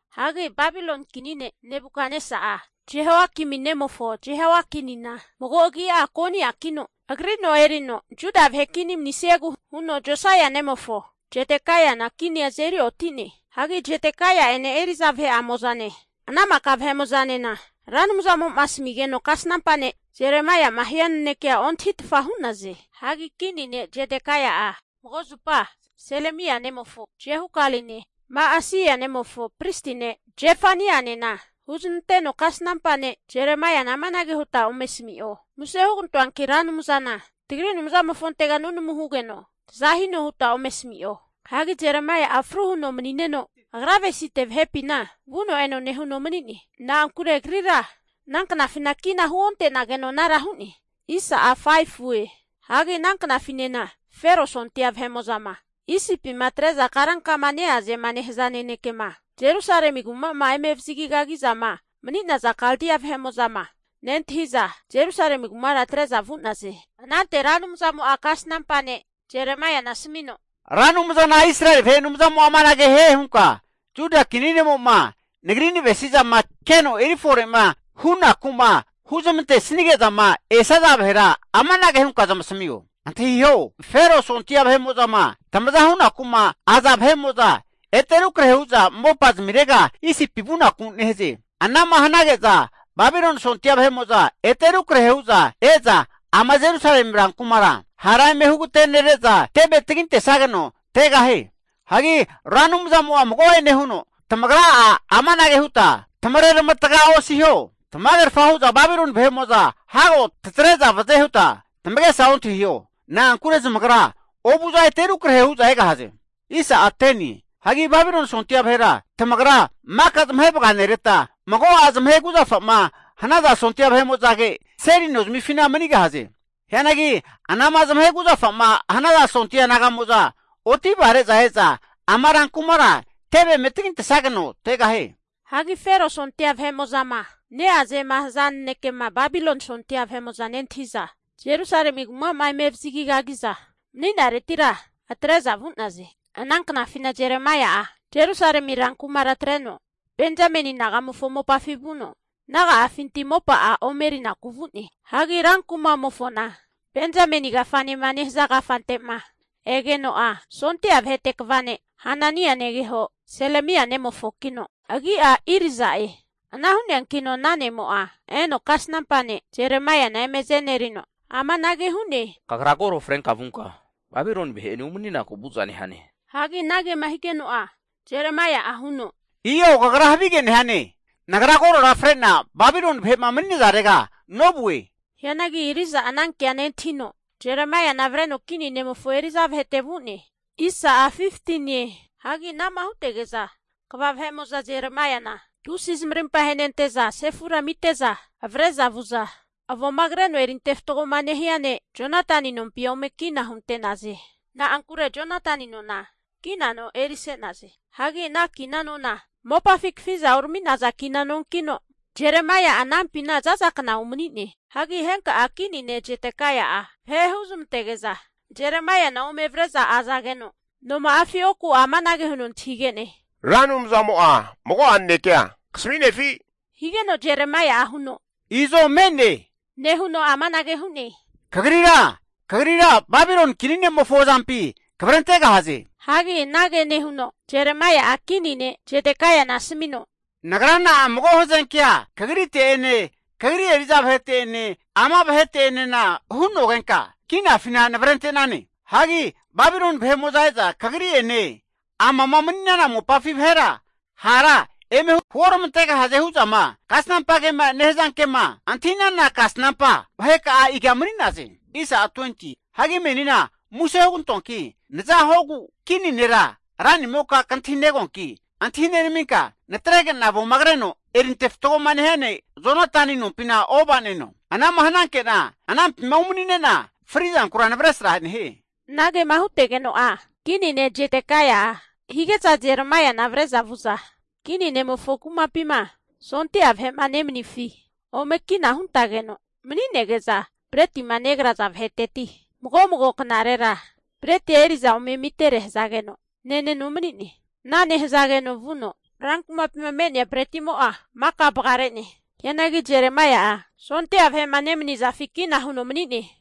Hagi Babiloni kini ne' Nebukatnesa'a, Jehoiakimi nemofo Jehoiakinina mago agi'a Koniakino agri no erino Juda vahe kini manisiegu huno, Josaia nemofo Zedekaiana kinia azeri oti'ne. Hagi Zedekaia'ene eri'za vahe'amo'zane ana maka vahemo'zanena Ra Anumzamo'ma asamigeno kasnampa ne' Jeremaia'ma hia nanekea ontahitfa hu'naze. Hagi kini ne' Zedekaia'a mago zupa Selemia nemofo Jehukaline Ma'aseia nemofo pristi ne' Zefanianena huznanteno, kasnampa ne' Jeremaiana amanage huta ome asami'o. Muse hugantoanki Ra Anumzana tagri Anumzamofontega nunamu hugeno taza hino huta ome asami'o. Hagi Jeremaia'a fru huno mani'neno agra avesite vahepina vuno eno nehuno mani'ne. Na'ankure agrira ana knafina kina huonte'nageno anara hu'ne. Hagi ana knafinena Fero sondia vahe'mo'zama Isipima atre'za karankama neazema nehaza nanekema, Jerusalemi kuma'ma eme avazagi kagi'zama mani'naza Kaldia vahe'mo'zama nentahiza, Jerusalemi kumara atre'za vu'naze. Anante Ra Anumzamo'a kasnampa ne' Jeremaiana asamino, Ra Anumzana Israeli vahe Anumzamo'a amanage hie hunka, Juda kini ne'mo'ma Nagri navesi'zama keno eri fore hunaku'ma huzmante'sanige'zama esaza vahera amanage hunka zamasamio. Antahiho! Fero sondia vahe'mo'zama tamaza hunaku'ma aza vahe'mo'za ete rukrahe hu'za mopa zamirega Isipi vunaku nehaze. Ana'ma hanage'za Babiloni sondia vahe'mo'za ete rukrahe hu'za e'za ama Jerusalemi rankumara hara eme hugatenere'za teve tagintesageno tegahie. Hagi Ra Anumzamo'a mago'ene huno, Tamagra'a amanage huta tamare ramataga osiho. Tamagerfa hu'za Babiloni vahe'mo'za hago tatre'za vaze huta tamagesa ontahio. Na'ankura zamagra ovu'za ete rukrahe hu'za egahaze. Hagi Babiloni sondia vahera tamagra maka zamahe vaganereta, mago'a zamahe kuzafa'ma hanaza sondia vahe'mo'zage seli nozamifina manigahaze. Hianagi anama zamahe kuzafa'ma hanaza sondia naga'mo'za otivare'za e'za ama rankumara teve eme tagintesageno tegahie. Hagi Fero sondia vahe'mo'zama neazema haza nanekema Babiloni sondia vahe'mo'za nentahi'za, Jerusalemi kumama eme avazagi kagi'za mani'naretira atre'za vu'naze. Ana knafina Jeremaia'a Jerusalemi rankumara atreno, Benzameni nagamofo mopafi vuno, naga'afinti mopa'a ome erinaku vu'ne. Hagi rankumamofona Benzameni kafanema nehaza kafante'ma egeno'a, sondia vahete kva ne' Hanania negeho, Selemia nemofokino agi'a Irija'e. Ana hu'neankino ana ne'mo'a eno kasnampa ne' Jeremaiana eme azenerino amanage hu'ne. Kagra koro frenka vunka Babiloni vahe'ene umaninaku vu'za nehane. Hagi anagema higeno'a Jeremaia'a huno, i'o kagra havige nehane. Nagra korora fre'na Babiloni vahe'ma mani'nazarega novue. Hianagi Irija'a anankea nontahino Jeremaiana avreno kini nemofo eri'za vahete vu'ne. Hagi ana'ma hutege'za kva vahe'mo'za Jeremaiana tusi zamarimpa ahenente'za sefura amite'za avre'za vu'za, avoma kreno erinte fatgoma nehia ne' Jonatani nompi ome kina hunte'naze. Na'ankure Jonatani nona kina no erise'naze. Hagi ana kina nona mopafi kafi'za urami'naza kina nonkino, Jeremaia'a anampina za'za kna umani'ne. Hagi henka kini ne' Jedekaia'a vahe huzmantege'za Jeremaiana ome avre'za azageno, noma'afi oku'a amanage huno antahige'ne. Ra Anumzamo'a mago'a nanekea kasami'nefi? higeno Jeremaia'a huno, i'zo me'ne nehuno amanage hu'ne. Kagrira Babiloni kini ne'mofo azampi kavrentegahaze. Hagi anage nehuno Jeremaia'a kini ne' Jedekaiana asamino, nagra na'a mago hazenkea kagrite'ene, kagri eri'za vahete'ene, ama vahete'enena hu'nogenka, kinafina navrente'nane? Hagi Babiloni vahe'mo'za e'za kagri'ene amama mani'nana mopafi vahe'enena hara eme huoramantegahaze hu'zama, kasnampa kema nehaza kema antahi'nana kasnampa vaheka'a iga mani'naze? Hagi menina muse hugantoanki, naza huogu kini nera ranimoka kantahi negoanki antahi nenaminka, natrege'na avoma kreno erinte fatgoma nehia ne' Jonatani nompina ova'neno. Ana'ma hananke'na anampima umanine'na fri'zankura navesra nehie. Anagema hutegeno'a kini ne' Jedekaia'a hige'za Jeremaiana avre'za vu'za, kini ne'mofo kumapima sondia vahe'ma nemanifi ome kina huntageno mani'nege'za, bretima negraza vaheteti mago mago knarera bretia eri'za ome amitere hazageno neneno mani'ne. Ana nehazageno vuno rankumapima me'nea bretimo'a maka vagare'ne. Hianagi Jeremaia'a sondia vahe'ma nemanizafi kina huno mani'ne.